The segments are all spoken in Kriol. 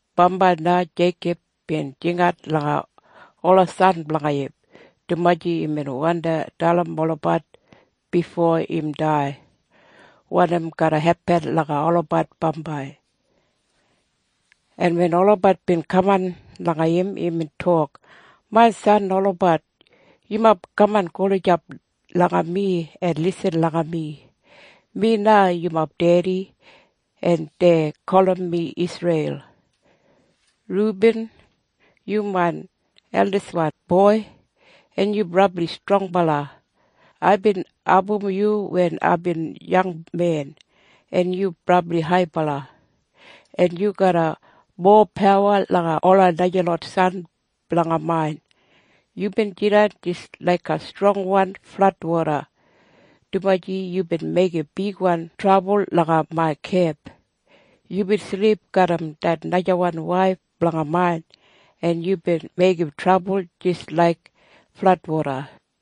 Bambai na Jeikob bin jingat langa ola san blanga im, dumaji imbin wandi dalim olabat bifo im dai wanim garra hepin langa olabat bambai. En wen olabat bin kaman langa im, imbin tok, “Main san olabat, yumob kaman gulijap langa mi en lisin langa mi. Mi na yumob dedi, en dei gulum mi Isreil. “Rubin, yu main eldiswan boi, en yu brabli strongbala. Aibin abum yu wen aibin yangmen. En yu brabli haibala, en yu garram mowa pawa langa ola najalot san blanga main. Yubin jidan jis laiga strongwan fladwoda, dumaji yubin meigim bigwan trabul langa main kemp. Yubin silip garram det najawan waif blanga main, en yubin meigim trabul jis laiga fladwoda.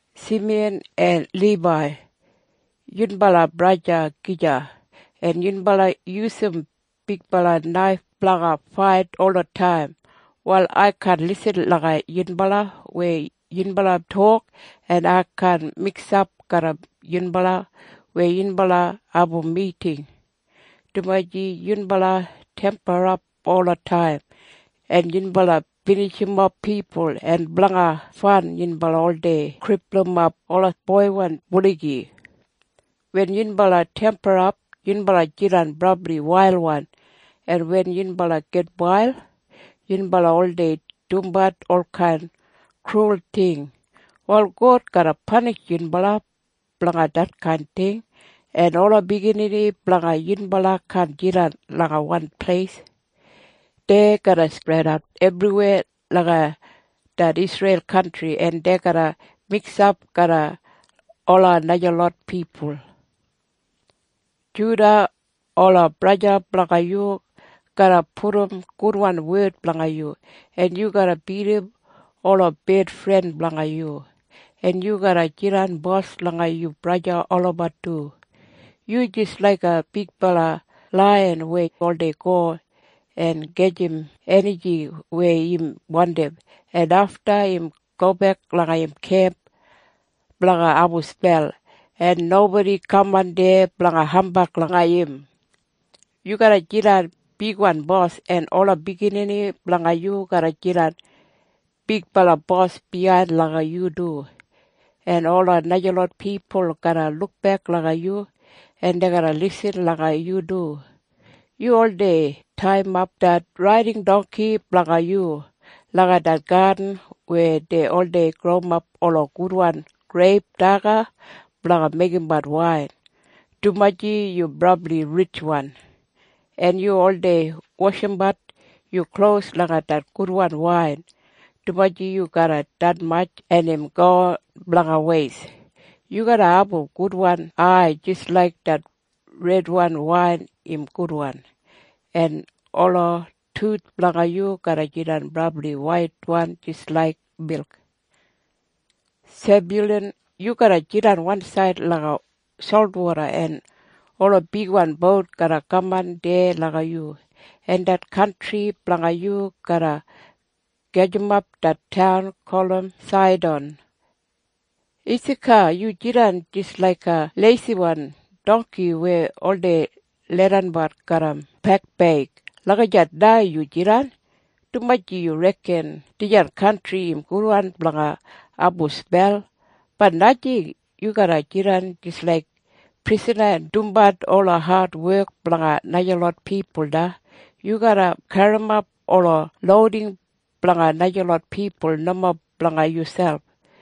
“Simiyan en Libai, yunbala braja gija. En yunbala yusum bigbala naif blanga fait olataim. Wal ai kaan lisin langa yunbala weya yunbala tok, en ai kaan miksap garram yunbala weya yunbala abum miting, dumaji yunbala temperap olataim, en yunbala binijimof pipul, en blanga fan yunbala oldei kripulumap ola boiwan buligi. Wen yunbala temperap, yunbala jidan brabli wailwan. En wen yunbala gitwail, yunbala oldei dumbat olkain krul ting. Wal God garra panishim yunbala blanga detkain ting, en ola biginini blanga yunbala kaan jidan langa wan pleis. Dei garra spredat ebriweya langa det Isreil kantri, en dei garra miksap garra ola najalot pipul. “Juda, ola braja blanga yu garra pudum gudwan wed blanga yu, en yu garra bidim ola bedfren blanga yu, en yu garra jidan bos langa yu braja olabat du. Yu jis laiga bigbala laiyan weya oldei go en gajim enijing weya im wandim, en afta im gobek langa im kemp blanga abum spel, en nobodi kaman deya blanga hambag langa im. Yu garra jidan bigbala bos, en ola biginini blanga yu garra jidan bigbala bos biyain langa yu du. En ola najalot pipul garra lukbek langa yu, en dei garra lisin langa yu du. Yu oldei taiyimap det raiding dongki blanga yu langa det gadin weya dei oldei growimap ola gudwan greip daga blanga meigimbat wain, dumaji yu brabli ritjwan. En yu oldei washimbat yu klos langa det gudwan wain, dumaji yu garram detmatj, en im gowin blanga weist. Yu garra abum gudwan ai jis laik det redwan wain im gudwan, en ola tuth blanga yu garra jidan brabli waitwan jis laik milk. “Sebyulan, yu garra jidan wansaid langa solwoda, en ola bigbala bout garra kaman deya langa yu, en det kantri blanga yu garra gajimap det taun gulum Saidan. “Isaka, yu jidan jis laiga leisiwan dongki weya oldei leidanbat garram pekbeig. Lagijat na yu jidan, dumaji yu reken dijan kantri im gudwan blanga abumbat spel. Bat najing. Yu garra jidan jis laiga prisana en dumbat ola adwek blanga najalot pipul na. Yu garra garrimap ola louding blanga najalot pipul, nomo blanga yuselp.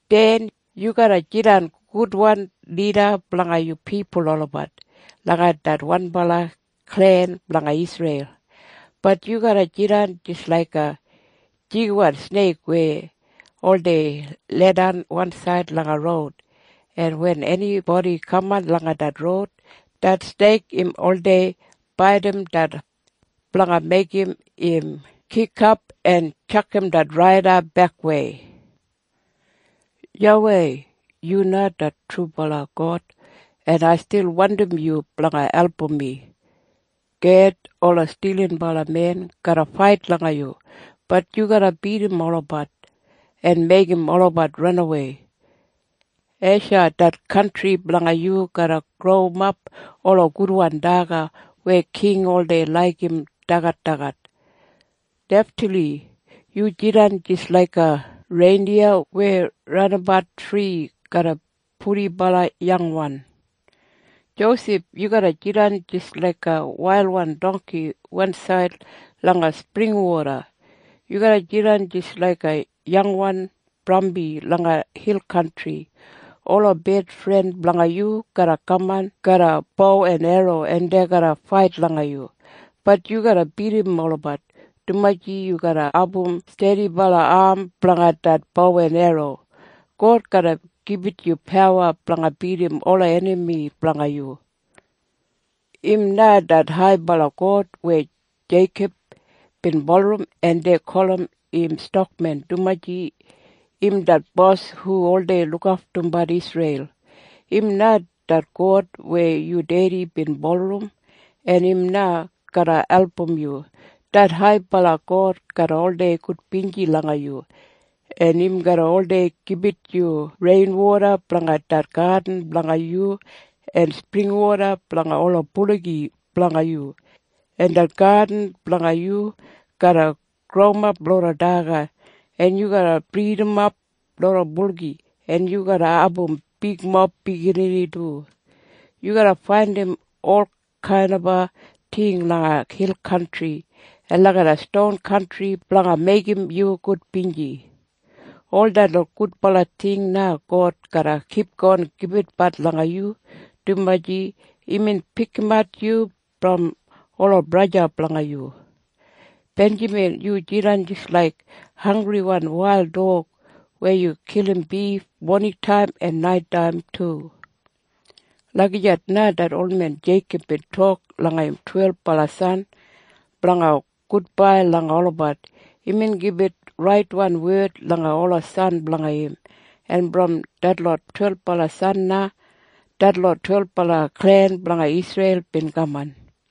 “Den, yu garra jidan gudwan lida blanga yu pipul olabat, langa det wanbala klen blanga Isreil. Bat yu garra jidan jis laiga jigiwan sneik weya oldei leidan wansaid langa roud, en wen enibodi kaman langa det roud, det sneik im oldei baidim det hos blanga meigim im kikap en tjakam det raida bekwei. “YAWEI, yu na det trubala God, en ai stil wandim yu blanga album mi. “Ged, ola stilinbalamen garra fait langa yu. Bat yu garra bidim olabat en meigim olabat ranawei. “Esha, det kantri blanga yu garra growimap ola gudwan daga weya king oldei laigim dagadagat. “Neftali, yu jidan jis laiga reindiya weya ranabat fri garram purdiwan biginini. “Josef, yu garra jidan jis laiga wailwan dongki wansaid langa springwoda. Yu garra jidan jis laiga yangwan brambi langa hil kantri. Ola bedfren blanga yu garra kaman garram bo en erro, en dei garra fait langa yu. Bat yu garra bidim olabat, dumaji yu garra abum stedibala am blanga det bo en erro. God garra gibit yu pawa blanga bidim ola enami blanga yu. Im na det haibala God weya Jeikob bin bulurrum. En dei gulum im Stakmen, dumaji im det bos hu oldei lukaftumbat Isreil. Im na det God weya yu dedi bin bulurrum. En im na garra album yu. Det haibala God garra oldei gudbinji langa yu, en im garra oldei gibit yu reinwoda blanga det gadin blanga yu en springwoda blanga ola buligi blanga yu. En det gadin blanga yu garra growimap loda daga, en yu garra bridimap loda buligi, en yu garra abum bigmob biginini du. Yu garra faindim olkain ting langa hil kantri en langa ston kantri blanga meigim yu gudbinji. Ol detlot gudbala ting na God garra kipgon gibitbat langa yu, dumaji imbin pikimat yu brom ola braja blanga yu. “Benjamin, yu jidan jis laiga hanggriwan wail dog weya kilim bif moningtaim en naitaim du.” Lagijat na det olmen Jeikob bin tok langa im twelbala san blanga gudbai langa olabat. Imbin gibit raitwan wed langa ola san blanga im. En brom detlot twelbala san na detlot twelbala klen blanga Isreil bin kamat.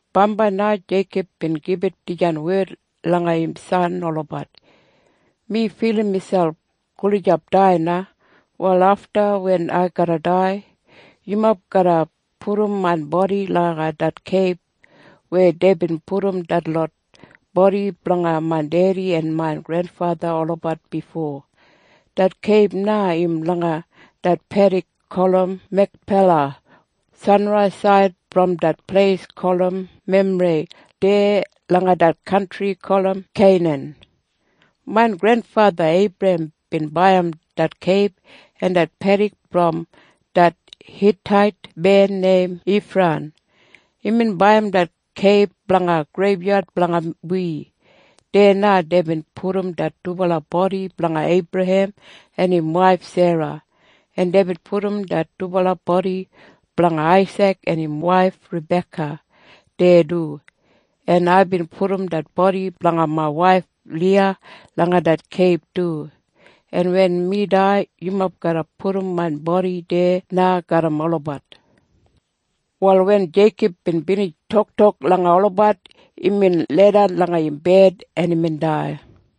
Bambai na Jeikob bin gibit dijan wed langa im san olabat, “Mi filim miselp gulijap dai na. Wal afta wen ai garra dai, yumob garra pudum main bodi langa det keib weya deibin pudum detlot bodi blanga main dedi en main grenfatha olabat bifo. Det keib na im langa det pedik gulum Mekpela sanraisaid brom det pleis gulum Memrei deya langa det kantri gulum Keinan. Main grenfatha Eibrahem bin baiyim det keib en det pedik brom det Hitait men neim Ifran. Imbin baiyim det keib blanga greibyad blanga wi. Deya na deibin pudum det dubala bodi blanga Eibrahem en im waif Sera, en deibin pudum det dubala bodi blanga Aisik en im waif Rabeka deya du. En aibin pudum det bodi blanga main waif Liya langa det keib du. En wen mi dai, yumob garra pudum main bodi deya na garram olabat.” Wal wen Jeikob bin binij toktok langa olabat, imbin leidan langa im bed, en imbin dai.